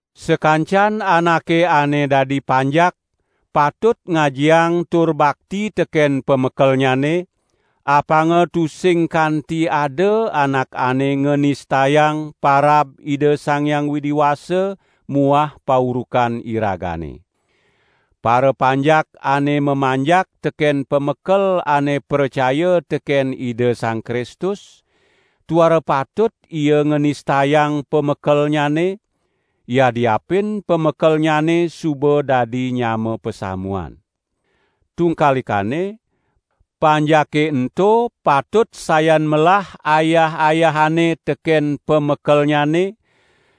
Sakancan anake ane dadi panjak patut ngajiang tur bakti teken pamekelnyane, apanga tusing kanti ada anak ane nganistayang parab Ida Sang Hyang Widi Wasa muah paurukan iragane. Parapanjak ane mamanjak teken pamekel ane pracaya teken Ida Sang Kristus, tuara patut ia nganistayang pamekelnyane, yadiapin pamekelnyane suba dadi nyama pasamuan. Tungkalikane, panjake ento patut sayan melah ayah-ayahanne teken pamekelnyane,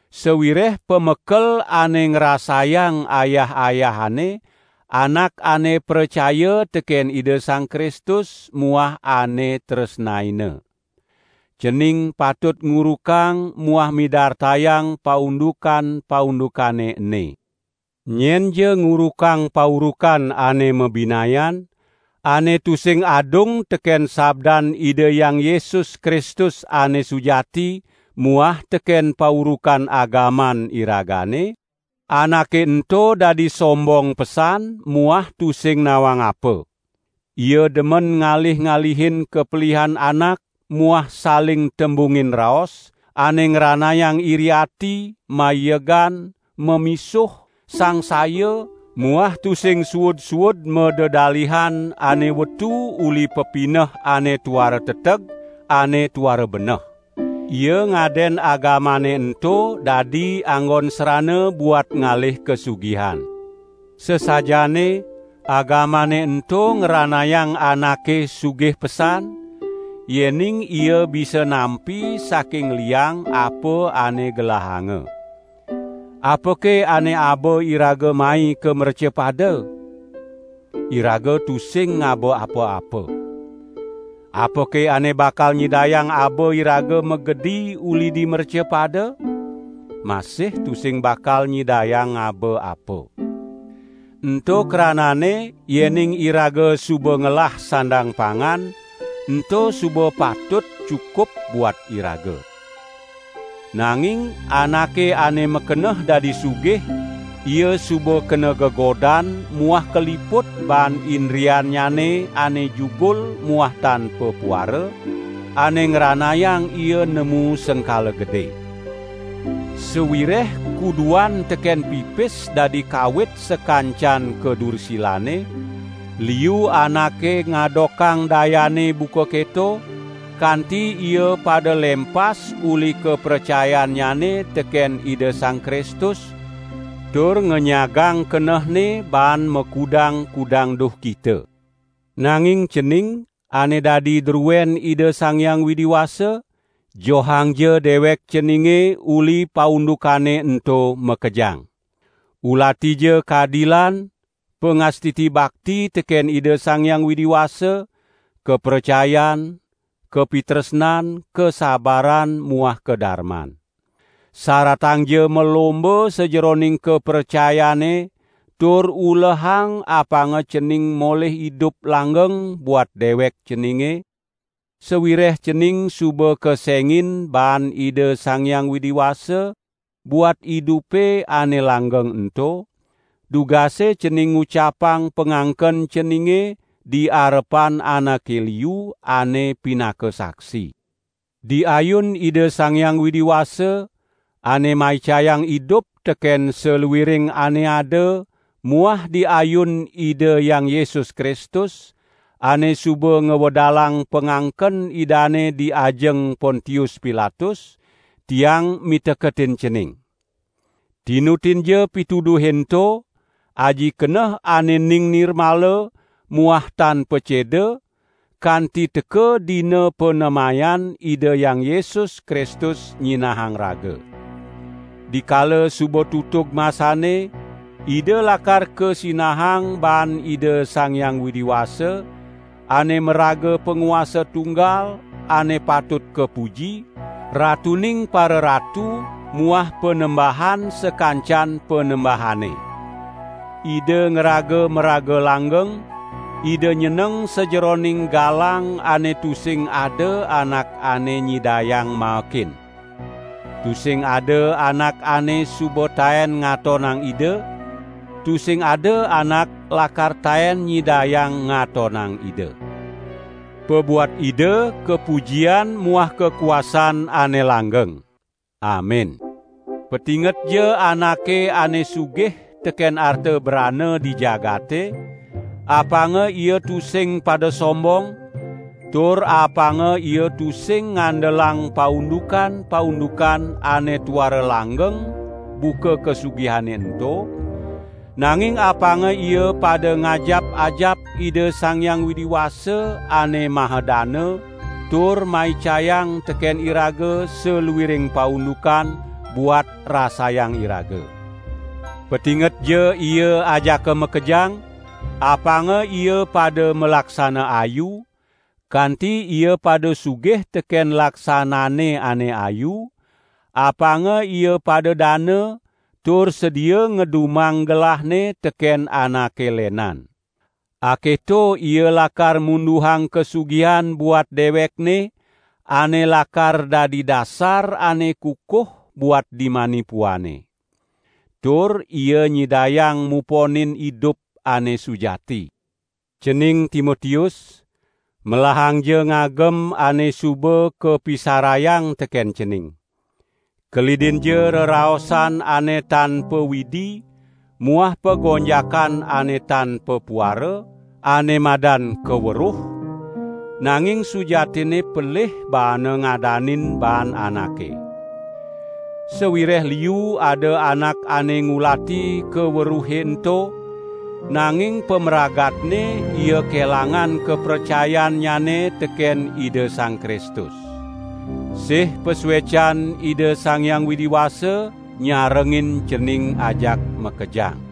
sawireh pamekel ane ngrasayang ayah-ayahanne, anak ane pracaya teken Ida Sang Kristus muah ane tresnaina. Cening patut ngurukang muah midartayang paundukan-paundukane ene. Nyenja ngurukang paurukan ane mabinayan, ane tusing adung teken sabdan Ida Hyang Yesus Kristus ane sujati muah teken paurukan agaman iragane, anake ento dadi sombong pesan muah tusing nawang apa. Ia demen ngalih-alihin kapelihan anak muah saling tembungin raos, ane ngranayang iri ati, maiegan, mamisuh, sangsaya, muah tusing suud-suud madedalihan ane wetu uli pepineh ane tuara teteg, ane tuara beneh. Ida ngaden agamane ento dadi anggon srana buat ngalih kasugihan. Sasajaane, agamane ento ngranayang anake sugih pesan, yening ia bisa nampi saking liang apa ane gelahanga. Apake ane aba iraga mai ka mrecapada? Iraga tusing ngaba apa-apa. Apake ane bakal nyidayang aba iraga magedi uli di mrecapada? Masih tusing bakal nyidayang ngaba apa. Ento krananne yening iraga suba ngelah sandang pangan, ento suba patut cukup buat iraga. Nanging anake ane makeneh dadi sugih, ia suba kena gegodan muah kaliput baan indriannyane ane jugul muah tan papuara, ane ngranayang ia nemu sengkala gede. Sawireh kuduan teken pipis dadi kawit sakancan kadursilane, liu anake ngadokang dayane buka keto, kanti ia pada lempas uli kapracayannyane teken Ida Sang Kristus tur ngenyagang kenehne baan makudang-kudang duhkita. Nanging cening, ane dadi druen Ida Sang Hyang Widi Wasa, johangja dewek ceninge uli paundukane ento makejang. Ulatija kadilan, pangastiti bakti teken Ida Sang Hyang Widi Wasa, kapracayan, kapitresnan, kasabaran muah kadarman. Saratangja malomba sajeroning kapracayane tur ulehang apanga cening molih idup langgeng buat dewek ceninge, sawireh cening suba kesengin baan Ida Sang Hyang Widi Wasa buat idupe ane langgeng ento, dugase cening ngucapang pangangken ceninge di arepan anake liu ane pinaka saksi. Di ayun Ida Sang Hyang Widi Wasa, ane maicayang idup teken saluiring ane ada muah di ayun Ida Hyang Yesus Kristus, ane suba ngwedalang pangangken idane di ajeng Pontius Pilatus, tiang miteketin cening! Tinutinja pituduhe ento, aji keneh ane ening nirmala muah tan paceda kanti teka Dina panemayan Ida Hyang Yesus Kristus nyinahang raga. Dikala suba tutug masanne, Ida lakar kasinahang baan Ida Sang Hyang Widi Wasa, ane maraga Panguasa tunggal ane patut kapuji, Ratuning pararatu muah Panembahan sakancan panembahane. Ida ngraga maraga langgeng, Ida nyeneng sajeroning galang ane tusing ada anak ane nyidayang maekin. Tusing ada anak ane suba taen ngatonang Ida, tusing ada anak lakar taen nyidayang ngatonang Ida. Pabuat Ida kapujian muah kakuasan ane langgeng. Amin. Patingetja anake ane sugih teken arta brana di jagate, apanga ia tusing pada sombong, tur apanga ia tusing ngandelang paundukan-paundukan ane tuara langgeng buka kasugihane ento, nanging apanga ia pada ngajap-ajap Ida Sang Hyang Widi Wasa ane maha dana tur maicayang teken iraga saluiring paundukan, buat rasayang iraga. Patingetja ia ajaka makejang, apanga ia pada malaksana ayu, kanti ia pada sugih teken laksanane ane ayu, apanga ia pada dana, tur sedia ngedumang gelahne teken anake lenan. Aketo ia lakar munduhang kasugihan buat dewekne ane lakar dadi dasar ane kukuh buat dimani puane. Tur ia nyidayang muponin idup ane sujati. Cening Timotius, melahangja ngagem ane suba kapisarayang teken cening. Kelidinja reraosan ane tan pawidi muah pagonjakan ane tan papuara, ane madan "Kaweruh", nanging sujatinne pelih baana ngadanin baan anake. Sawireh liu ada anak ane ngulati kaweruhe ento, nanging pamragatne ia kelangan kapracayannyane teken Ida Sang Kristus. Sih pasuecan Ida Sang Hyang Widi Wasa nyarengin cening ajak makejang.